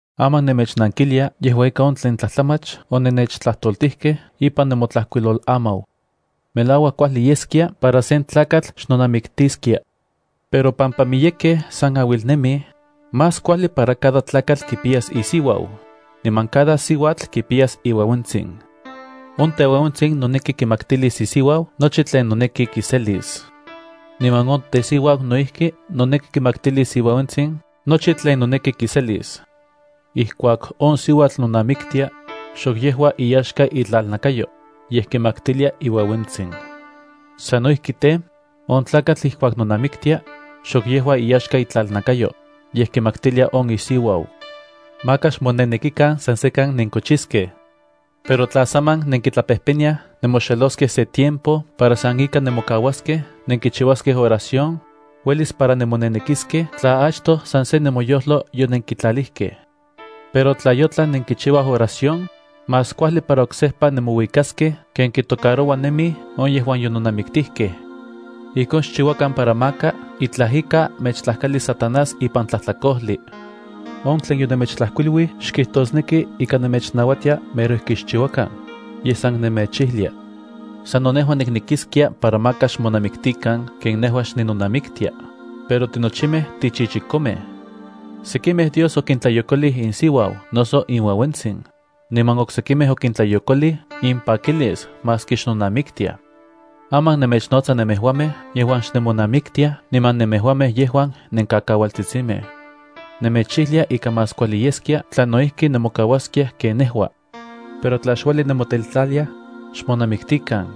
Aman nemechnankilia yejua ika on tlen tlajtlamach onennechtlajtoltijkej ipan nemotlajkuilolamau. Melauak kuajli yeskia para sen tlakatl xnonamiktiskia. Pero pampa miyekej san auilnemij, más kuajli para cada tlakatl kipiyas isiuau, niman cada siuatl kipiyas iueuentsin. On teueuentsin noneki kimaktilis isiuau nochi tlen noneki kiselis. Niman on tesiuau no ijki noneki kimaktilis iueuentsin nochi tlen noneki kiselis. Ijkuak on siuatl nonamiktia, xok yejua iyaxka itlalnakayo, yej kimaktilia iueuentsin. Sano ijki tej, on tlakatl ijkuak nonamiktia, xok yejua iyaxka itlalnakayo, yej kimaktilia on isiuau. Maka xmonenekikan san sekan nenkochiskej. Pero tla saman nenkitlapejpeniyaj nemoxeloskej se tiempo para san ika nemokauaskej nenkichiuaskej oración, uelis para nemonenekiskej tla achtoj san se nemoyojlo yonenkitlalijkej. Pero tla yotlan nenkichiuaj oración, más kuajli para oksejpa nemouikaskej ken kitocaroua nemij on yejuan yononamiktijkej. Ijkon xchiuakan para maka itlaj ika mechtlajkalis Satanás ipan tlajtlakojli. On tlen yonemechtlajkuiluij xkijtosneki ika nemechnauatia mero ijki xchiuakan, yej san nemechijlia. Sano nejua niknekiskia para maka xmonamiktikan ken nejua xninonamiktia, pero tinochimej tichichikomej. Sekimej Dios okintlayokolij insiuau noso inueuentsin, niman oksekimej okintlayokolij impakilis maski xnonamiktiaj. Aman nemechnotsa nemejuamej yejuan xnemonamiktiaj niman nemejuamej yejuan nenkakaualtsitsimej. Nemechijlia ika más kuajli yeskia tla no ijki nemokauaskiaj ken nejua. Pero tla xueli nemoteltlaliaj, xmonamiktikan,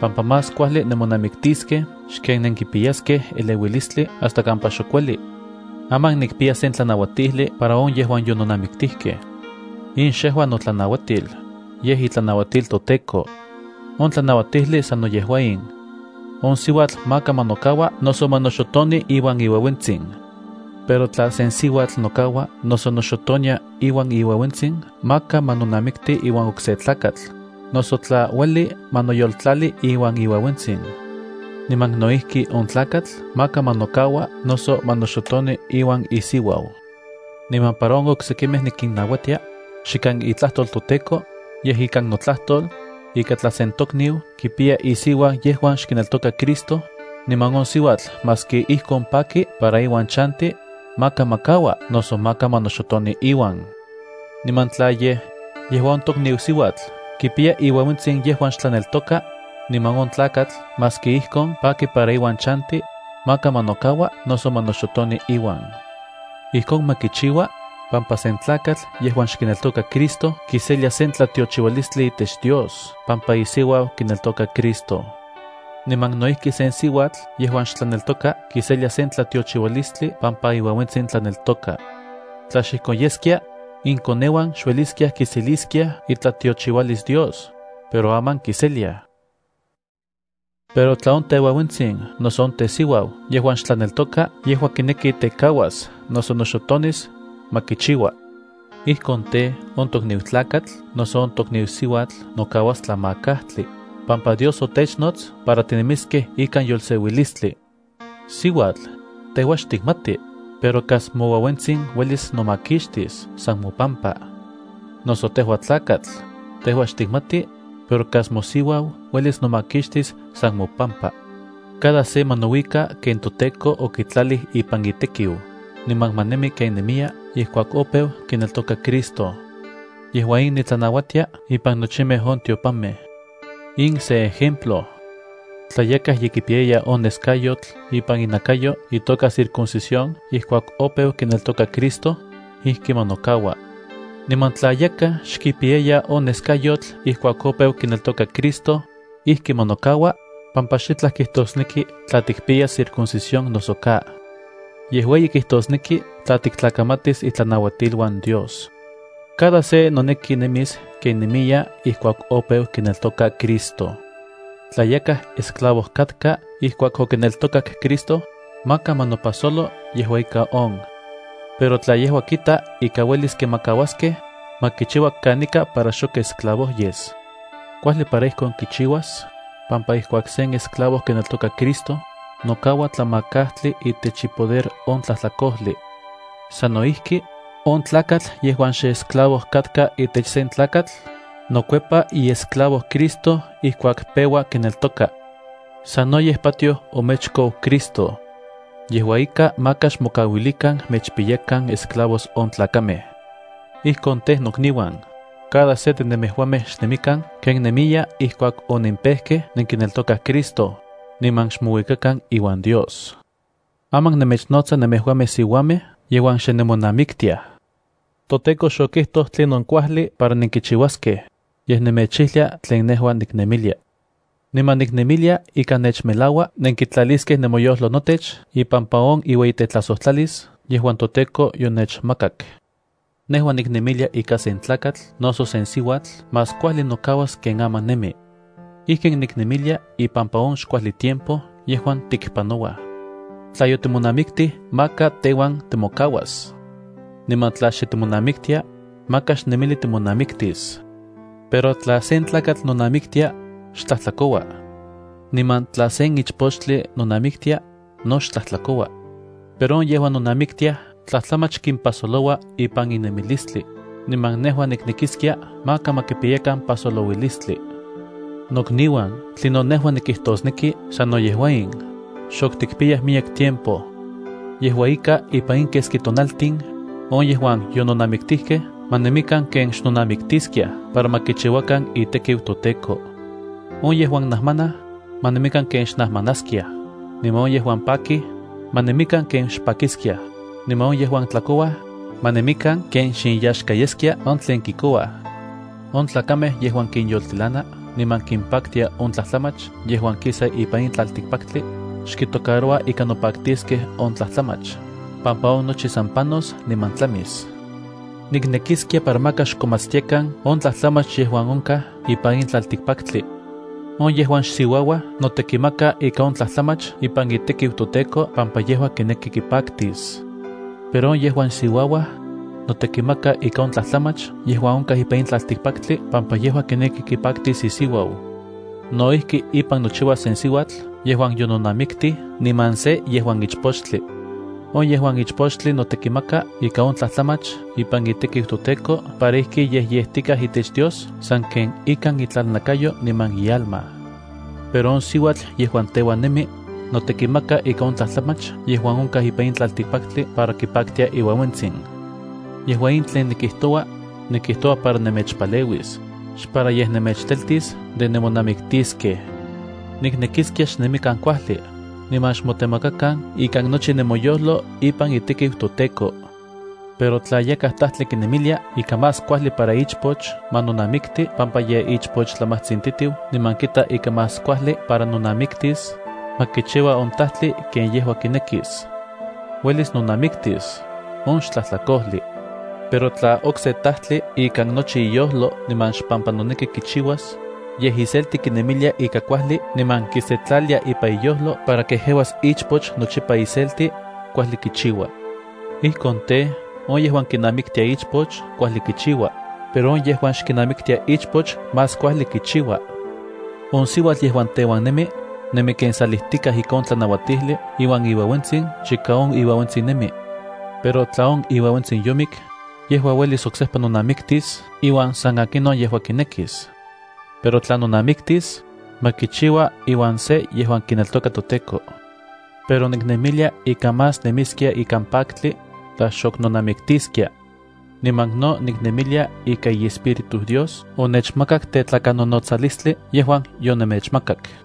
pampa más kuajli nemonamiktiskej xken nenkipiyaskej eleuilistli hasta kampa xok ueli. Aman nikpiya sen tlanauatijli para on yejuan yononamiktijkej. In xejua notlanauatil, yej itlanauatil toTEKO. On tlanauatijli sano yejua in. On siuatl maka ma nokakaua noso ma noxotoni iuan iueuentsin. Pero tla sen siuatl nokakaua noso noxotonia iuan iueuentsin, maka ma nonamikti iuan okse tlakatl, noso tla, ueli ma noyoltlali iuan iueuentsin. Niman no ijki on tlakatl maka ma nokakaua noso ma noxotoni iuan isiuau. Niman para on oksekimej nikinnauatia, xikan itlajtol toTEKO, yej ikan notlajtol, ika tla sen tokniu kipiya isiuau yejuan xkineltoka Cristo, niman on siuatl maski ijkon paki para iuan chanti, maka ma kaua noso maka ma noxotoni iuan. Niman tla yej, yejua on tokniu siuatl kipiya iueuentsin yejuan xtlaneltoka, niman on tlakatl maski ijkon paki para iuan chanti, maka ma nokaua noso ma noxotoni iuan. Ijkon ma kichiua, pampa sen tlakatl yejuan xkineltoka Cristo kiselia sen tlatiochiualistli itech Dios pampa isiuau kineltoka Cristo. Niman no ijki sen siuatl yejuan xtlaneltoka kiselia sen tlatiochiualistli pampa iueuentsin tlaneltoka. Tla xijkon yeskia, inkoneuan xueliskiaj kiseliskiaj itlatiochiualis Dios, pero aman kiseliaj. Pero tla on teueuentsin noso on tesiuau yejuan xtlaneltoka yejua kineki tekauas noso noxotonis, ma kichiua. Ijkon tej, on tokniu tlakatl noso on tokniu siuatl nokauas tlamakajtli, pampa Dios otechnots para tinemiskej ikan yolseuilistli. Siuatl, tejua xtikmati, pero kas moueuentsin uelis nomakixtis san mopampa. Noso tejua tlakatl, tejua xtikmati, pero kas mosiuau uelis nomakixtis san mopampa. Cada se ma nouika ken toTEKO okitlalij ipan itekiu, niman ma nemi ken nemiya ijkuak opeu kineltoka Cristo. Yejua in nitlanauatia ipan nochimej on tiopanmej. In se ejemplo. Tla yakaj ye kipiyaya on neskayotl ipan inakayo itoka circuncisión ijkuak opeu kineltoka Cristo, ijki ma nokaua. Niman tla yakaj xkipiyaya on neskayotl ijkuak opeu kineltoka Cristo, pampa xitlaj kijtosneki tla tikpiyas circuncisión noso ka. Yej ueyi kijtosneki tla tiktlakamatis itlanauatiluan Dios. Cada se noneki nemis ken nemiya ijkuak opeu kineltoka Cristo. Tla yakaj esclavo katka ijkuak okineltokak Cristo, maka ma nopajsolo yejua ika on. Pero tla yejua kita ika uelis kimakauaskej, ma kichiua kanika para xok esclavo yes. Kuajli para ijkon kichiuas, pampa ijkuak sen esclavo kineltoka Cristo, nokaua tlamakajtli itech ipoder on tlajtlakojli. Sano ijki, on tlakatl yejuan xesclavo katka itech sen tlakatl, nokuepa iesclavo Cristo ijkuak peua kineltoka. Sanoyej patioj omechkou Cristo. Yejua ika maka xmokauilikan mechpiyakan esclavos on tlakamej. Ijkon tej, nokniuan, cada se de nemejuamej xnemikan ken nemiya ijkuak onenpejkej nenkineltokaj Cristo, niman xmouikakan iuan Dios. Aman nemechnotsa nemejuamej siuamej yejuan xe nonamiktiaj. ToTEKO xokijtoj tlinon kuajli para nenkichiuaskej, yej nemechijlia tlen nejua niknemilia. Niman niknemilia ika nechmelaua nenkitlaliskej nemoyojlo notech ipampa on iueyitetlajsotlalis yejuan toTEKO yonechmakak. Nejua niknemilia ika sen tlakatl noso sen siuatl más kuajli nokauas ken aman nemi. Ijkin niknemilia ipampa on xkuajli tiempo yejuan tikpanouaj. Tla yotimonamiktij, maka teuan timokauas. Niman tla xe timonamiktia, maka xnemili timonamiktis. Pero tla sen tlakatl nonamiktia, xtlajtlakoua. Niman tla sen ichpochtli nonamiktia, no xtlajtlakoua. Pero on yejuan nonamiktiaj tlajtlamach kimpajsoloua ipan in nemilistli, niman nejua niknekiskia maka ma pajsolouilistli. Nokniuan, tlinon nejua nikijtosneki sano yejua in: xok tikpiyaj miyek tiempo. Yejua ika, ipan in keski tonaltin, on yejuan yononamiktijkej ma nemikan ken xnonamiktiskiaj para ma kichiuakan itekiu toTEKO. On yejuan najmanaj, ma nemikan ken xnajmanaskiaj, niman on yejuan pakij, ma nemikan ken xpakiskiaj, niman on yejuan tlakouaj, ma nemikan ken xinyaxka yeskia on tlen kikouaj. On tlakamej yejuan kinyoltilana niman kinpaktia on tlajtlamach yejuan kisa ipan in tlaltikpaktli, xkitocaroua ika nopaktiskej on tlajtlamach, pampa on nochi san panos niman tlamis. Niknekiskia para maka xkonmatstiakan on tlajtlamach yejuan onkaj ipan in tlaltikpaktli. On yejuan xsiuauaj notekimaka ika on tlajtlamach ipan itekiu toTEKO pampa yejua kineki kipaktis. Pero on yejuan siuauaj, notekimaka ika on tlajtlamach yejuan onkaj ipan in tlaltikpaktli pampa yejua kineki kipaktis isiuau. No ijki ipan nochiua sen siuatl yejuan yononamiktij niman se yejuan ichpochtli. On yejuan ichpochtli notekimaka ika on tlajtlamach ipan itekiu toTEKO para ijki yejyejtikaj itech Dios sanken ikan itlalnakayo niman ialma. Pero on siuatl yejuan teuan nemi, notekimaka ika on tlajtlamach yejuan onkaj ipan in tlaltikpaktli para kipaktia iueuentsin. Yejua in tlen nikijtoua, nikijtoua para nemechpaleuis, xpara yej nemechteltis de nemonamiktiskej. Niknekiskia xnemikan kuajli, niman xmotemakakan ikan nochi nemoyojlo ipan itekiu toTEKO. Pero tla yakaj tajtli kinemilia ika más kuajli para ichpoch ma nonamikti pampa ye ichpochlamajtsintitiu niman kita ika más kuajli para nonamiktis, ma kichiua on tajtli ken yejua kinekis. Uelis nonamiktis; on xtlajtlakojli. Pero tla okse tajtli ikan nochi iyojlo niman xpampa noneki kichiuas, yej iselti kinemilia ika kuajli niman kisetlalia ipan iyojlo para kejeuas ichpoch nochipa iselti, kuajli kichiua. Ijkon tej, on yejuan kinamiktia ichpoch kuajli kichiua, pero on yejuan xkinamiktia ichpoch más kuajli kichiua. On siuatl yejuan teuan nemi, nemi ken salijtikaj ika on tlanauatijli iuan iueuentsin chika on iueuentsin nemi. Pero tla on iueuentsin yomik, yejua uelis oksejpa nonamiktis iuan san akinon yejua kinekis. Pero tla nonamiktis, ma kichiua iuan se yejuan kineltoka toTEKO. Pero niknemilia ika más nemiskia ikan paktli, tla xok nonamiktiskia. Niman no niknemilia ika iEspíritu Dios onechmakak tetlakanonotsalistli yejuan yonemechmakak.